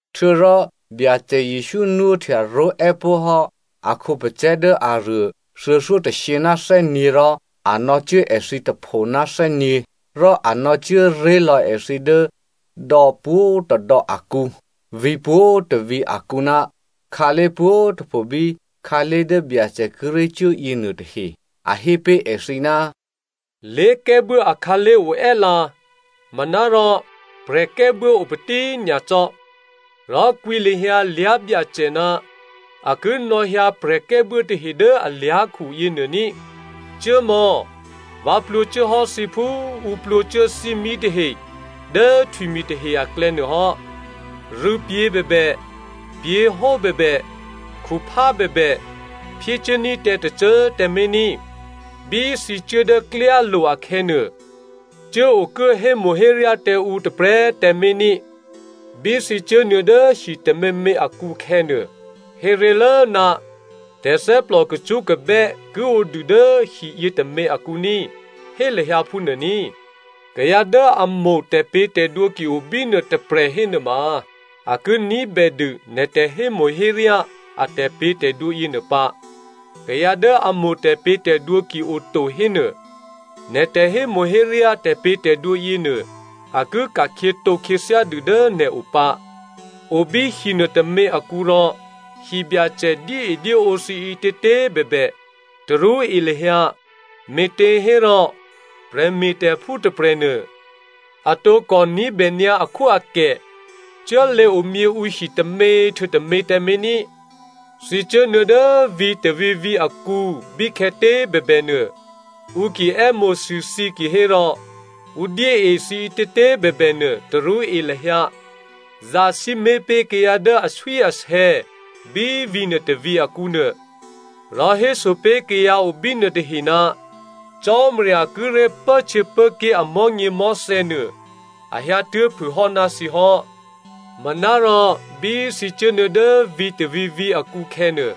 Htuô̌rò Byacè Jesǔ nwóhtya ró̤è́ pó̤ hò́ a khǒpacè̤̌ dố aruô thuô̌thyótôshyě ná thè́nyě̤ rò a nò̌cuố èthǐ tôpho ná thè́nyě̤. Rò a nò̌ cuố ré̤ lò̌ èthǐ dố dò̌ pwǒ̤tôdò̌ akǔ, vǐ̤ pwǒ̤tôvǐ̤ akǔ ná khǎlé̤ pwǒ̤꤮ tôpho bí khǎlé̤ dố Byacè kíré̤ cuố yěnuô tahe. A hé pé̤ èthǐ, “Lé̤kè́buố akhǎlé̤ oè́lǎ, manárò prè̤kè́buố opatí꤮ nyacò́. Rò kwǐ lahyǎ lyá̤byacè ná a ki nò̌hyǎ prè̤kè́buố tahe dố alyá̤khu yěnuô ní꤮. Cuốmò̌! Vǎ plwǒcuố hò́ thǐ phú ǔ plwǒcuố thímí tahe dố htwimi̤ tahe aklè̌nuô hò́. Rû̌pyě̤ bèbè, pyě̤hó bèbè, khuphá bèbè, phyécuốní̤ tǎ tôcô꤮ tǎmé̤ ní꤮. Bí thǐ cuố dố klyálo̤ akhè̌nuô, cuố okuố hémo̤héryá tǎ ǔ tôprè̤꤮ tǎmé̤ ní꤮. “Bí thǐ cuốnuô̌ dố hi tôměmě akǔ khè̌nuô, héré̤lố, ‘Tè̤thè́plò kacṳ́kabè́ ki o dû dố hiyě tômě akǔ ní꤮!’ Hé lahyǎ phúnuô ní꤮. Kayǎ dố a mo̤ tè̤pě̤tè̤dwǒ ki o bínuô tôprè̤ hénuôma, a ki ní̤bè dû nè̤ tè̤hémo̤héryá a tè̤pě̤tè̤dwǒ yěnuô pǎ. Kayǎ dố a mo̤ tè̤pě̤tè̤dwǒ ki oto hénuô, nè̤ tè̤hémo̤héryá tè̤pě̤tè̤dwǒ yěnuô a ki ka̤khyětǒ khyěthyá dû dố nè̤ o pǎ. O bí hinuô tômě akǔ rò hibyacè dyéedyéǒ thǐ ǐtětě꤮ bèbè, tarú e lahyǎ, me̤těhérò prè̤me̤tè̤phú tôprè̤nuô, a tǒkò ní̤bè nyǎ akhwóakè. Cuốlěomyě ǔhi tômě htuô̌ tômě tǎmé̤ ní꤮. “Thǐ cuốnuô̌ dố vǐ̤ tôvǐ̤vǐ̤ akǔ bíkhè̌tě꤮ bèbè nuô, ǔ ki è́mo̤sû thǐ kihérò, ǔ dyée thǐ ǐtětě꤮ bèbè nuô, tarú e lahyǎ. Zasǐmé̤ pé̤ kayǎ dố aswíasè̌ bí vǐ̤nuô tôvǐ̤ akǔ nuô. Rò héso pé̤ kayǎ o bínuô tahe, ‘Cò́marya kíré̤ pốhtyěpốké̤ amò̤́nyěmò̤́thè̌ nuô a hyǎtuố̤phû hò́ ná thǐ hò́.’ Manárò bí thǐ cuốnuô̌ dố vǐ̤ tôvǐ̤vǐ̤ akǔ khè̌nuô,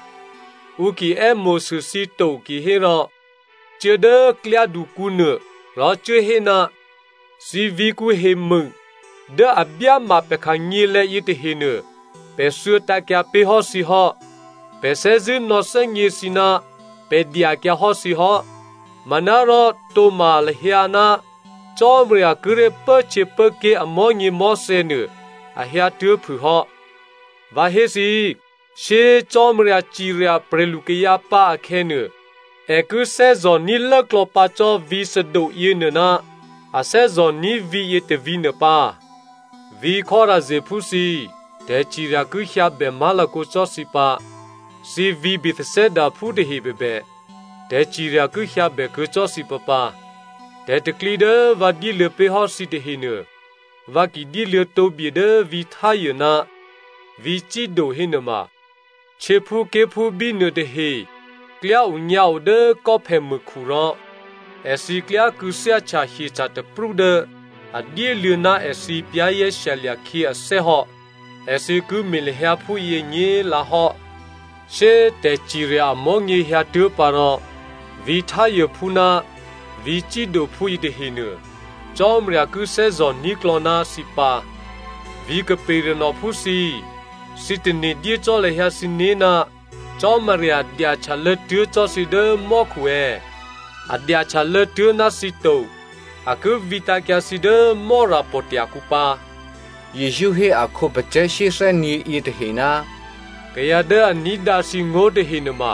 ǔ ki è́mo̤sû thǐ to kihérò, cuố dố klyádukǔnuô, rò cuố hé, ‘Thǐ vǐ̤kǔ hemû dố a byáma pè̤ khanyělè̤̌ yětahenuô, pè̤ thuô̌tǎ̤kyǎ pé̤hò́ thǐ hò́. Pè̤ thè́zṳ̂́ nò̌thè́gně thǐ ná pè̤ dyakyǎhò́ thǐ hò́. Manárò tǒ̤ma lahyǎ ná Cò́marya kíré̤ pốhtyěpốké̤ amò̤́nyěmò̤́thè̌ nuô a hyǎtuố̤phû hò́.’ Vǎ hé thǐ, shyé꤮ Cò́marya cirya prè̤lukayǎ pǎ akhè̌nuô, è ki thè́zò̤ní̤ lốklò̌ pǎ cò́ vǐ̤ Sodom yěnuô ná a thè́zò̤ní̤ vǐ̤yě tôvǐ̤nuô pǎ. “Vǐ̤ Chorazinphú thǐ꤮, tè̤cirya ki hyǎbè má̤lakǒ cò́ thǐ pǎ. Thǐ vǐ̤ Bethsaidaphú tahe bèbè, tè̤cirya ki hyǎbè kuô̌ cò́ thǐ pǎpǎ. Tè̤pro̤tè̤prya̤ dố vǎ dyéluô̌ pé̤ hò́ thǐ tahenuô, vǎ ki dyéluô̌ tǒbye dố vǐ̤ Tyre ná vǐ̤ Sido hénuôma, htyěphúké̤phú bínuô tahe klyá onyǎo dố kò́phèmûkhu rò èthǐ klyá kû̌thyáhtya hyeca̤taprú dố a dyéluô̌ ná èthǐ za̤ ní̤dû khyě ané̤ hò́, èthǐ ki me̤ lahyǎ phúyě nyě̤lǎhò́. Shyé꤮ tè̤cirya amò̤́nyě hyǎtuố̤ pǎ rò, vǐ̤ Tyrephú ná vǐ̤ Sidophú yětahenuô, Cò́marya ki thè́zò̤ní̤klò̌ ná thǐ pǎ. Vǐ̤ Capernaumphú thǐ꤮, thǐ tane̤ dyé cò́ lahyǎ thǐné̤ ná Cò́marya dyahtyalô̌ tuố̤ cò́ thǐ dố mò́khu è̌? A dyahtyalô̌ tuố̤ ná thǐ to. A ki vǐtǎ̤kyǎ thǐ dố Mò́rapò̤tya̤ kǔ pǎ!” Jesǔ hé a khǒpacè̤̌ shyéthè́nyě̤ yětahe, “Kayǎ dố a ní̤dǎ thǐngó̤ tahe nuôma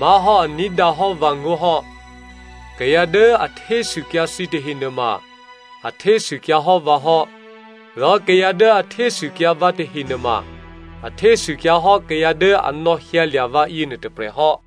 má̤hò́ a ní̤dǎ hò́ vǎngó̤ hò́. Kayǎ dố a htésûkyǎ thǐ tahe nuôma a htésûkyǎhò́ vǎ hò́. Rò kayǎ dố a htésûkyǎ vǎ tahe nuôma a htésûkyǎhò́ kayǎ dố a nò̌hyǎlya̤ vǎ yěnuô tôprè̤ hò́.”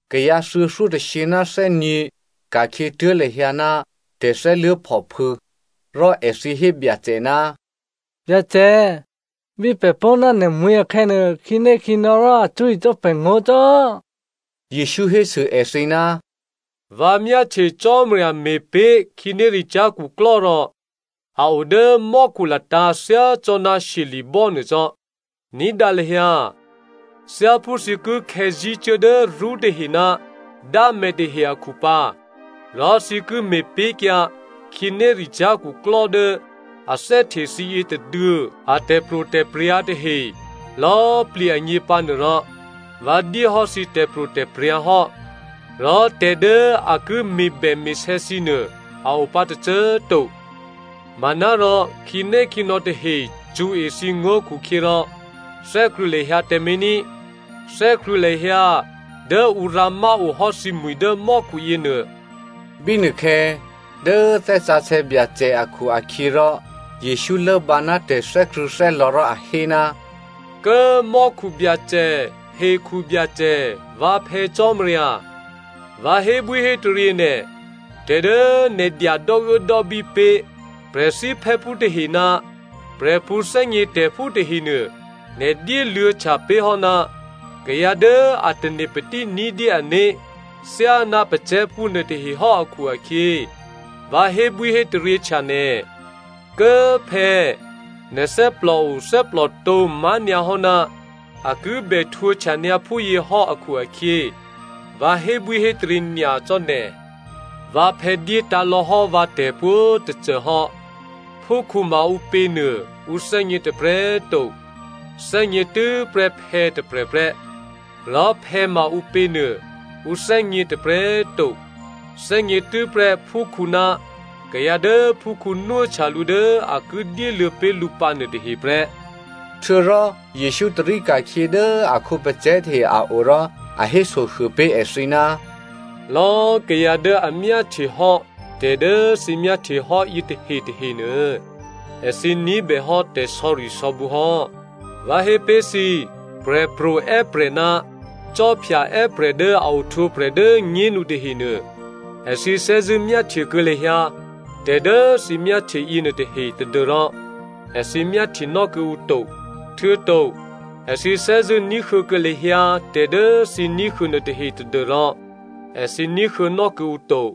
Kayǎ thuô̌thyótôshyě ná thè́nyě̤ ka̤khyětuố̤ lahyǎ ná tè̤thè́luố̤phòphû̌. Rò èthǐ hé Byacè, “Byacè, bí pè̤ pó̤ ná nè̤mwi̤ akhè̌nuô, khǐnékhǐnò̌ rò a cṳ̌e cò́ pè̤ngó̤ cò́.” Jesǔ hésû èthǐ, “Vǎ myáhtye Cò́marya me̤pé̤ khǐnéricyá̤ khuklò́ rò a o dố mò́khu latǎ̤ thyá cò́ ná shyeli̤bò́ nuô cò́. Ní̤dǎ lahyǎ! Thyáphú thǐ ki khè̌zí̤cuố dố rṳ́tahe ná dǎmè̤tahe akhu pǎ, rò thǐ ki me̤pé̤kyǎ khǐnéricyá̤ khuklò́ dố a thè́hte thǐ yětôduô̌ a tè̤pro̤tè̤prya̤ tahe lò̌꤮ plǐ agně pǎnuô rò, vǎ dyéhò́ thǐ tè̤pro̤tè̤prya̤ hò́. Rò tè̤ dố a ki me̤bème̤sè̌ thǐ nuô a opǎ tôcô꤮ to. Manárò, khǐnékhǐnò̌ tahe cṳ̌e thǐngó̤ khukhyěrò thè́krṳ̂̌ lahyǎ tǎmé̤ ní꤮. Thè́krṳ̂̌ lahyǎ dố ǔ rǎmá o hò́ thǐmwi̤ dố mò́khu yěnuô.” Bínuôkhè̌, dố Thè́ Sǎsè̌ Byacè akhu-akhyěrò Jesǔ lốbǎ ná tè̤thè́krṳ̂̌thè́lò̌ rò a hé, “Kố꤮ mò́khu Byacè, hekhu Byacè, vǎ Phè̌ Cò́marya꤮, vǎ hébwíhétaryě nè̤, tè̤ dố nè̤ dya dò́uốdò́bí pé̤ prè̤thíphè́phú tahe ná prè̤pṳ̌thè́gnětè̤phú tahenuô, nè̤ dyéluô̌htya pé̤hò́ ná kayǎ dố a tane̤patí ní̤dyé ané̤ thyáná pacè̤̌phú nuôtahehò́ akhu-akhyě, vǎ hébwíhétaryěhtya nè̤. Kố꤮ phè̌꤮, nè̤ thè́plòo thè́plòtǒ má̤nyǎhò́ ná a kibè htwǒhtyanyǎ phúyěhò́ akhu-akhyě, vǎ hébwíhétaryě nyacò́ nè̤. “Vǎphè̌ dyétǎ̤lò̌ hò́ vǎ tè̤pwǒ̤꤮ tôcô hò́. Phúkhǔ ma ǔpěnuô ǔ thè́gně tôprè̤꤮ to. Thè́gně tû́prè́ phè̌tôprè̤ prè́. Rò phè̌ ma ǔpěnuô ǔ thè́gně tôprè̤꤮ to, thè́gně tû́prè́ phúkhǔ ná kayǎ dố phúkhǔ nwóhtya lǔ dố a ki dyéluô̌ pé̤ lǔ pǎ nuôtahe prè́.” Htuô̌rò Jesǔ tarí ka̤khyě dố a khǒpacè̤̌ tahe a o rò a hésohuô pé̤ èthǐ, “Lò̌꤮ kayǎ dố a myáhtye hò́ tè̤dố thǐ myáhtye hò́ yětahe tahenuô, èthǐ ní̤bèhò́ tè̤sò̌risò̌bǔ hò́. Vǎ hé pé̤ thǐ, prè̤pro̤ è́prè̤ ná khwí è́prè̤ dố a ohtwǒprè̤ dố꤮ nyénu tahenuô, èthǐ thè́zṳ̂́ myáhtyekuô̌ lahyǎ tè̤ dố thǐ myáhtye yěnuôtahe tadû́rò èthǐ myáhtyenò́ kuô̌ǔ to. Htuô̌to èthǐ thè́zṳ̂́ ní̤huô̌kuô̌ lahyǎ tè̤ dố thǐ ní̤huô̌ nuôtahe tadû́rò èthǐ ní̤huô̌nò́ kuô̌ǔ to.”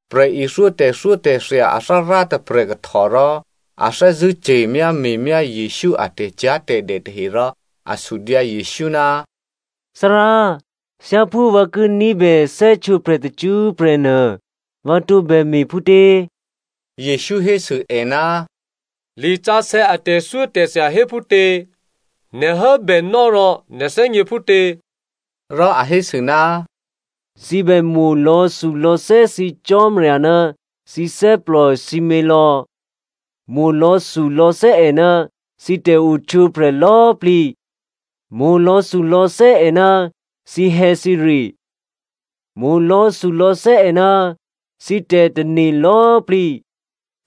Prè̤ithyó tè̤thyótè̤thya athárá tôprè̤ kahtò rò a thè́zṳ̂́ ce̤myáme̤myá Jesǔ a tè̤cyá̤tè̤dè tahe rò a sudyǎ Jesǔ, “Thárá꤮, thyáphú vǎ ki ní̤bè thè́htwǒprè̤ tacṳ́prè̤ nuô, vǎ tǒbè me̤ phútě?” Jesǔ hésû è, “Lisǎsè̌ a tè̤thyótè̤thya hé phútě? Nè̤ hốbènò́ rò nè̤ thè́gně phútě?” Rò a hésû, “‘Thǐ bè mo̤ lò̌thulò̌thè́ thǐ Byacè Cò́marya ná thǐ thè́plò sǐmělò̌, mo̤ lò̌thulò̌thè́ è ná thǐ tè̤ohtwǒprè̤ lò̌꤮ plǐ, mo̤ lò̌thulò̌thè́ è ná thǐhè̌thǐre, mo̤ lò̌thulò̌thè́ è ná thǐ tè̤tane̤ lò̌꤮ plǐ.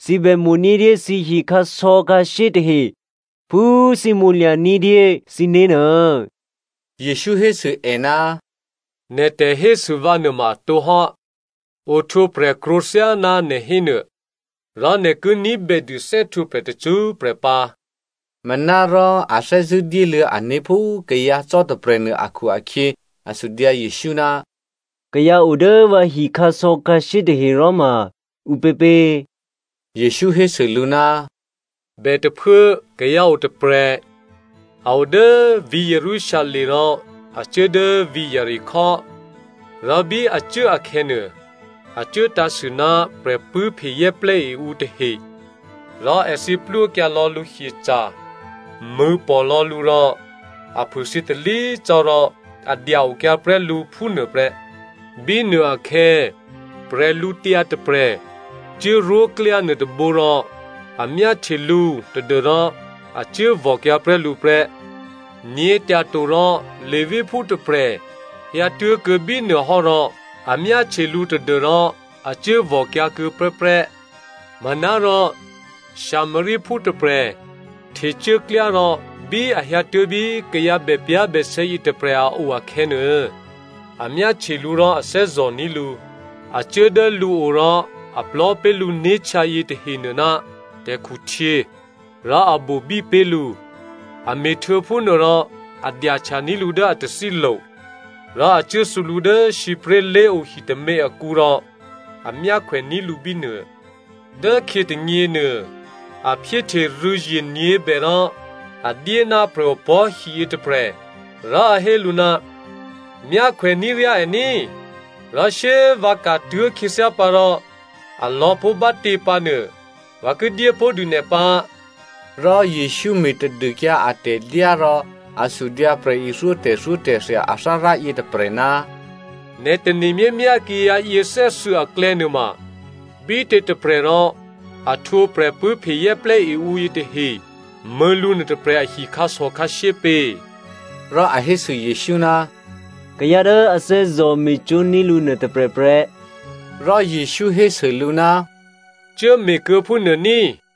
Thǐ bè mo̤ ní̤dyé thǐhi khǎsò̌khǎshyé tahe phú thǐ mo̤lya̤ ní̤dyé thǐné̤ nuô.’” Jesǔ hésû è, “Nè̤ tè̤hésû vǎ nuôma atǒ hò́. Ohtwǒprè̤ krwǒ thyáná nè̤ hénuô, rò nè̤ ki ní̤bè dû thè́htwǒprè̤ tacṳ́prè̤ pǎ.” Manárò a thè́zṳ̂́ dyéluô̌ ané̤ phú kayǎ cò́ tôprè̤nuô akhu-akhyě a sudyǎ Jesǔ, “Kayǎ o dố vǎhi khǎsò̌khǎshyé tahe rò ma ǔpěpě?” Jesǔ hésû lǔ, “Bètôphuố, kayǎ o tôprè̤, a o dố vǐ̤ Jerusalem rò a cuố dố vǐ̤ Jeriko. Rò bí a cuố akhè̌nuô, a cuố tǎ̤sû ná prè̤pṳ̂́phe zè́plè́e ǔ tahe, rò èthǐ plwókyǎ lò̌ lǔ hyeca̤, mṳ̂̌pò̤ lò̌ lǔ rò a phûthyě talí cò́ rò a dya-okyǎ prè́ lǔ phúnuô prè́. Bínuôakhè̌, prè̤lǔtyǎ tôprè̤ cuốrwóklyá nuôtôbǒ rò a myáhtye lǔ tadû́rò a cuốvò̤kyǎ prè́ lǔ prè́. Nyě̤tyato rò Leviphú tôprè̤ hyǎtuố̤kuô̌ bínuô hò́ rò a myáhtye lǔ tadû́rò a cuốvò̤kyǎ kuô̌ prè́prè́. Manárò Samariaphú tôprè̤ htecuốklyá rò bí a hyǎtuố̤ bí kayǎ bèpyá̤bèsè̌ yětôprè̤ a o akhè̌nuô, a myáhtye lǔ rò a thè́zò̤ní̤ lǔ. A cuố dố lǔo rò a plò̤́ pé̤ lǔné̤htyǎ yětahenuô ná tè̤khuhtyě, rò a bobí pé̤ lǔ. A me̤htuô̌ phúnuôrò a dyahtyaní̤ lǔ dố a tathílo̤, rò a cuố thǔ lǔ dố sǐpré̤lé̤o hitômě akǔ rò a myákhwèní̤ lǔ bínuô. Dốkhyě tônyěnuô, a phyéhte rû̌zye nyě̤bè rò a dyé ná prè̤opò̤́hi yětôprè̤ rò a hé lǔ, ‘Myákhwèní̤ ryá è ní꤮ rò shyé꤮ vǎ ka̤tuố̤ khyěthyá pǎ rò, alò̌ pó̤ bá꤮ tě pǎnuô vǎ ki dyé pó̤ dû nè̤ pǎ.’” Rò Jesǔ me̤tadûkyǎ atè̤dyá rò a sudyǎ prè̤ithyó tè̤thyótè̤thya athárá yětôprè̤, “Nè̤ tane̤ myámyá kayǎ yěthè́thuô̌ aklè̌ nuôma, bítětôprè̤ rò a htwǒ prè̤pṳ̂́phe zè́plè́e ǔ yětahe mṳ̂̌ lǔ nuôtôprè̤ ahi khǎsò̌khǎshyé pě?” Rò a hésû Jesǔ, “Kayǎ dố a thè́zò̤ me̤cwó̤ní̤ lǔ nuôtôprè̤ prè́.” Rò Jesǔ hésû lǔ, “Cuố me̤kuô̌ phúnuô ní꤮.”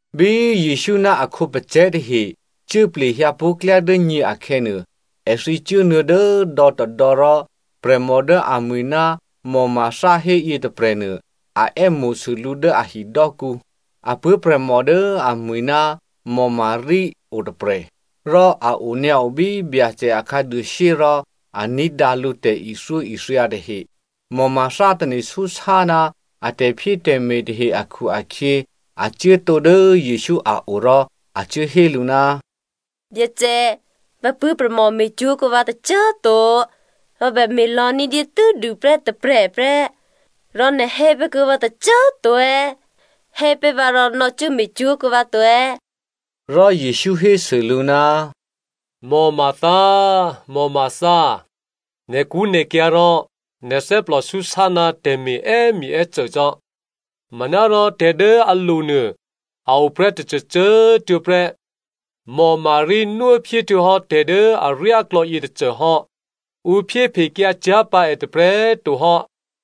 Bí Jesǔ ná a khǒpacè̤̌ tahe cuố plehyǎ pó̤ klyá dố nyě akhè̌nuô, èthǐ cuốnuô̌ dố dò̌tôdò̌ rò prè̤mò dố amwi̤ ná Martha héyě tôprè̤nuô a è́mo̤sû lǔ dố a hidò́kǔ. Apuố̤prè̤mò dố amwi̤ ná Maria o tôprè̤. Rò a onyǎo bí Byacè a khǎduôshyé rò a ní̤dǎ lǔ tè̤ithyóithya tahe. Martha tane̤súsá ná a tè̤phyétè̤me̤ tahe akhu-akhyě, a cuốtǒ dố Jesǔ a o rò a cuố hé lǔ, “Byacè꤮ vǎ puố̤prè̤mò me̤cwó̤kuô̌ vǎ tôcô꤮ to, vǎ bème̤ lò̌ ní̤dyé tû́dû prè́ tôprè̤ prè́, rò nè̤ hé pé̤ kuô̌ vǎ tôcô꤮ to è̌? Hé pé̤ vǎ rò nò̌cuố me̤cwó̤ kuô̌ vǎ to!” Rò Jesǔ hésû lǔ, “Martha, Martha! Nè̤kṳ́nè̤kyǎ̤ rò nè̤ thè́plò súsá ná tè̤me̤ è́myěè́cô cò́. Manárò tè̤ dố alo̤nuô a o prè́ tôcôcô tuô̌ prè́. Maria nwóphyé htuô̌hò́ tè̤ dố aryáklò̌ yětôcô hò́. Ǔ phyéphekyǎ cyá̤ pǎ è tôprè̤꤮ to hò́.”